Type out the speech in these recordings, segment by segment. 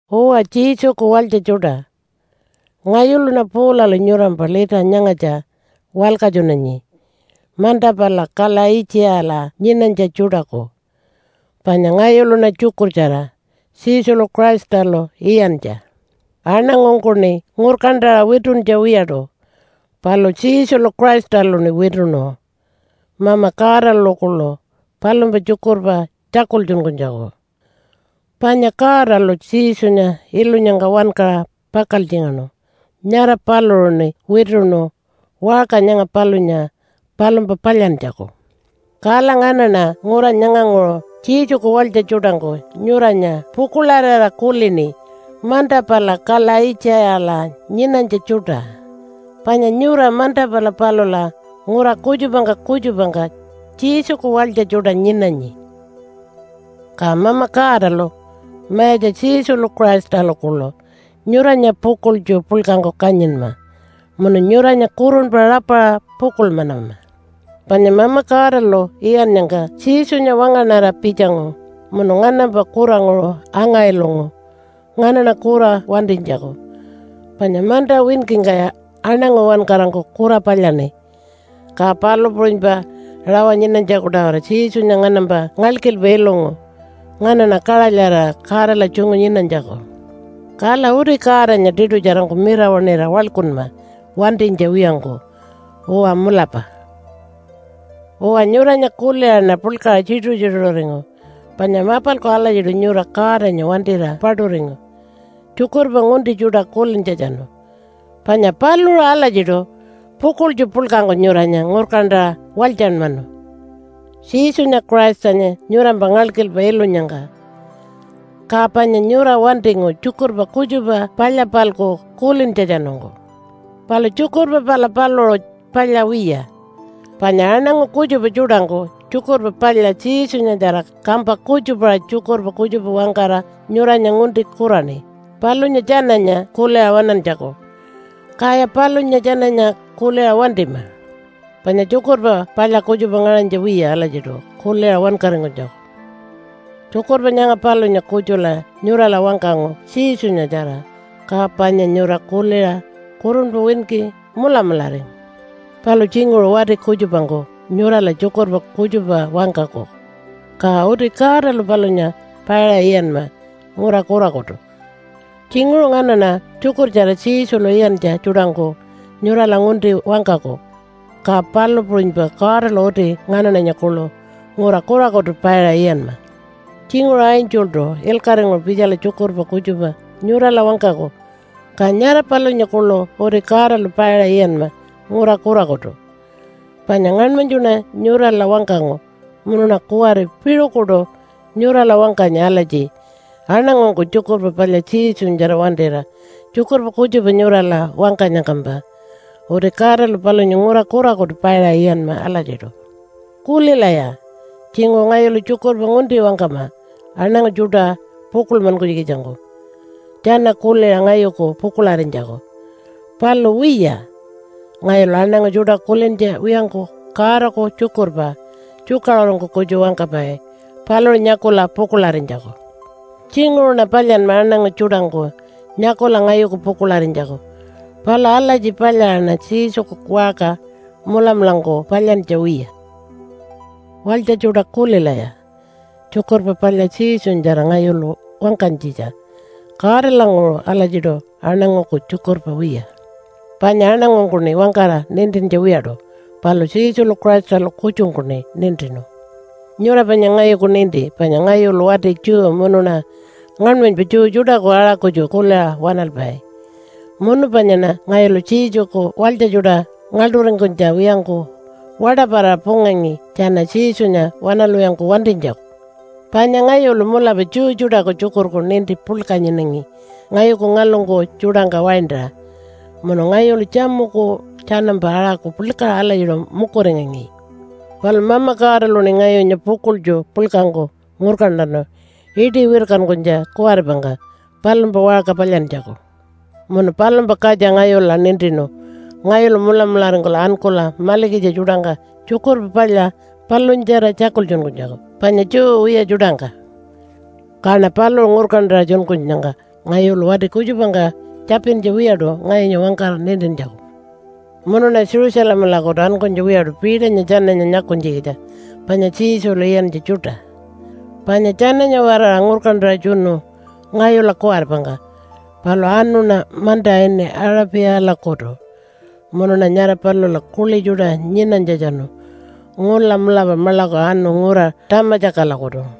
Uwa, Jesuku walytja tjuṯa, ngayuluṉa Paulalu nyurampa lita nyangatja walkatjunanyi manta pala Kalaitjiyala nyinanytja tjuṯaku. Panya ngayuluṉa tjukurtjara Jesulu Christalu iyantja. Aṉangungkuṉi ngurkantaṟa wituntja wiyaṯu, palu Jesulu Christaluṉi wituṉu Mama Godalu kuḻu palumpa tjukurpa tjakultjunkunytjaku. Panya Godalu Jesunya ilunyangka wankaṟa pakaltjingaṉu, nyara paluṟuṉi wituṉu waṟka nyanga palunya palumpa palyantjaku. Kala nganaṉa ngura nyanganguṟu Jesuku walytja tjuṯangku nyuranya pukuḻarira kulini manta pala Kalaitjiyala nyinanytja tjuṯa, panya nyura manta pala palula ngura kutjupangka kutjupangka Jesuku walytja tjuṯa nyinanyi. Ka Mama Godalu, Mayatja Jesulu Christalu kuḻu nyuranya pukuḻtju puḻkangku kanyinma munu nyuranya kurunpa rapaṟa pukuḻmanama. Panya Mama Godalu iyannyangka Jesunya wangaṉara pitjangu munu nganampa kuranguṟu anga-ilungu nganaṉa kura wantinytjaku. Panya manta winkingkaya aṉangu uwankarangku kura palyaṉi, ka palu puṟunypa rawa nyinanytjaku-tawara Jesunya nganampa ngalkilpa ilungu nganaṉa kaṟalyarira Godala tjungu nyinanytjaku. Kala uti Godanya tiṯutjarangku mirawaṉira waḻkunma wantinytja wiyangku. Uwa mulapa. Uwa, nyuranya kuliṟaṉa puḻkaṟa tjituṟu-tjituṟuringu panya mapalku alatjiṯu nyura Godanya wantira paṯuringu tjukurpa ngunti tjuṯa kulintjatjanu. Panya paluṟu alatjiṯu pukuḻtju puḻkangku nyuranya ngurkantaṟa walytjanmanu Jesunya Christanya nyurampa ngalkilpa ilunyangka. Ka panya nyura wantingu tjukurpa kutjupa palya-palku kulintjatjanungku. Palu tjukurpa pala paluṟu palya wiya. Panya aṉangu kutjupa tjuṯangku Tjukurpa Palya Jesunyatjara kampa kutjupaṟa tjukurpa kutjupa wangkara nyuranya ngunti kuraṉi palunya tjananya kuliṟa waṉantjaku. Kaya palunya tjananya kuliṟa wantima. Panya tjukurpa palya kutjupa ngaṟanytja wiya alatjiṯu kuliṟa wankaringkunytjaku. Tjukurpa nyanga palunya kutjula nyurala wangkangu Jesunyatjara, ka panya nyura kuliṟa kurunpa winki mulamularingu. Palu tjinguṟu wati kutjupangku nyurala tjukurpa kutjupa wangkaku, ka uti Godalu palunya paiṟa iyanma ngura kurakutu. Tjinguṟu nganaṉa tjukurtjara Jesulu iyantja tjuṯangku nyurala ngunti wangkaku, ka palu puṟunypa Godalu uti nganaṉanya kuḻu ngura kurakutu paiṟa iyanma. Tjinguṟu angeltu ilkaṟinguṟu pitjala tjukurpa kutjupa nyurala wangkaku ka nyara palunya kuḻu uti Godalu paiṟa iyanma ngura kurakutu. Panya ngaṉmanytjuṉa nyurala wangkangu munuṉa kuwari piṟukuṯu nyurala wangkanyi alatji aṉangungku Tjukurpa Palya Jesunyatjara wantira tjukurpa kutjupa nyurala wangkanyangkampa uti Godalu palunya ngura kurakutu paiṟa iyanma alatjiṯu. Kulilaya, tjinguṟu ngayulu tjukurpa ngunti wangkama aṉangu tjuṯa pukuḻmankunytjikitjangku tjana kuliṟa ngayuku pukuḻarinytjaku. Palu wiya, ngayulu aṉangu tjuṯa kulintja wiyangku Godaku tjukurpa tjukaṟurungku kutju wangkapai paluṟu nyakula pukuḻarinytjaku. Tjinguṟuṉa palyanma aṉangu tjuṯangku nyakula ngayuku pukuḻarinytjaku. Palu alatji palyaṟaṉa Jesuku waṟka mulamulangku palyantja wiya. Walytja tjuṯa kulilaya! Tjukurpa Palya Jesunyatjara ngayulu wangkanytjitja Godalanguṟu alatjiṯu aṉanguku tjukurpa wiya. Panya aṉangungkuṉi wangkara nintintja wiyaṯu palu Jesulu Christalu kutjungkuṉi nintinu. Nyura panya ngayuku ninti panya ngayulu wati Jew munuṉa ngaṉmanypa Jew tjuṯaku aṟa kutju kuliṟa waṉalpai, munu panyaṉa ngayulu Jesuku walytja tjuṯa ngaḻṯuringkunytja wiyangku waṯaparaṟa pungangi tjana Jesunya waṉalwiyangku wantinytjaku. Panya ngayulu mulapa Jew tjuṯaku tjukurku ninti puḻka nyinangi ngayuku ngalungku tjuṯangka waintaṟa, munu ngayulu tjamuku tjanampa aṟaku puḻkaṟa alatjiṯu mukuringangi. Palu Mama Godaluṉi ngayunya pukuḻtju puḻkangku ngurkantanu iṯi wirkankunytja kuwaripangka palumpa waṟka palyantjaku. Munu palumpa katja ngayula nintinu ngayulu mulamularingkula ankula malikitja tjuṯangka Tjukurpa Palya palunyatjara tjakultjunkunytjaku, panya Jew wiya tjuṯangka. Kaṉa paluṟu ngurkantaṟa tjunkunyangka ngayulu wati kutjupangka tjapintja wiyaṯu ngayunya wangkara nintintjaku. Munuṉa Jerusalemalakutu ankunytja wiyaṯu Peternya tjananya nyakunytjikitja panya Jesulu iyantja tjuṯa, panya tjananya-waraṟa ngurkantaṟa tjunu ngayula kuwaripangka. Palu anuṉa manta ini Aṟapiyalakutu munuṉa nyara palula kuḻi tjuṯa nyinanytjatjanu ngula mulapa maḻaku anu ngura Tamatjakalakutu.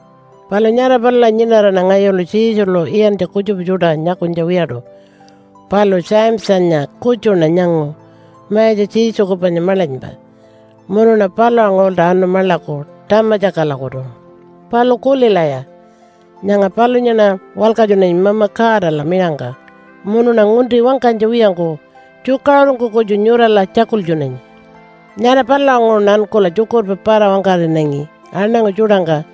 Palu nyara palula nyinaraṉa ngayulu Jesulu iyantja kutjupa tjuṯa nyakunytja wiyaṯu, palu Jamesanya kutjuṉa nyangu Mayatja Jesuku panya maḻanypa. Munuṉa palulanguṟulta anu maḻaku Tamatjakalakutu. Palu kulilaya, nyanga palunyaṉa walkatjunanyi Mama Godala miṟangka munuṉa ngunti wangkanytja wiyangku tjukaṟurungku kutju nyurala tjakultjunanyi. Nyara palulanguṟuṉa ankula tjukurpa para-wangkaṟinangi aṉangu tjuṯangka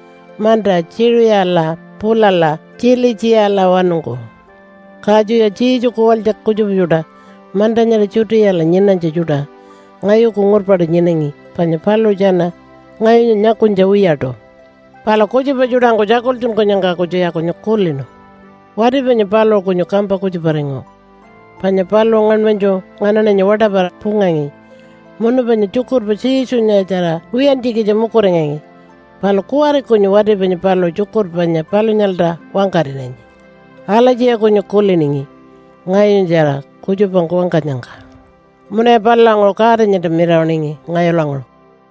manta Tjiṟiyala pulala Tjilitjiyalawanungku. Katjuya Jesuku walytja kutjupa tjuṯa manta nyara Judeala nyinanytja tjuṯa ngayuku ngurpaṯu nyinangi panya paluṟu tjana ngayunya nyakunytja wiyaṯu. Palu kutjupa tjuṯangku tjakultjunkunyangka kutjuya kunyu kulinu, “Wati panya paluṟu kunyu kampa kutjuparingu, panya paluṟu ngaṉmanytju nganaṉanya waṯaparaṟa pungangi munu panya tjukurpa Jesunyatjara wiyantjikitja mukuringangi. Palu kuwari kunyu wati panya paluṟu tjukurpa panya palunyalta wangkaṟinanyi.” Alatjiya kunyu kuliningi ngayunyatjara kutjupangku wangkanyangka. Munuya palulanguṟu Godanyalta mirawaṉingi ngayulanguṟu.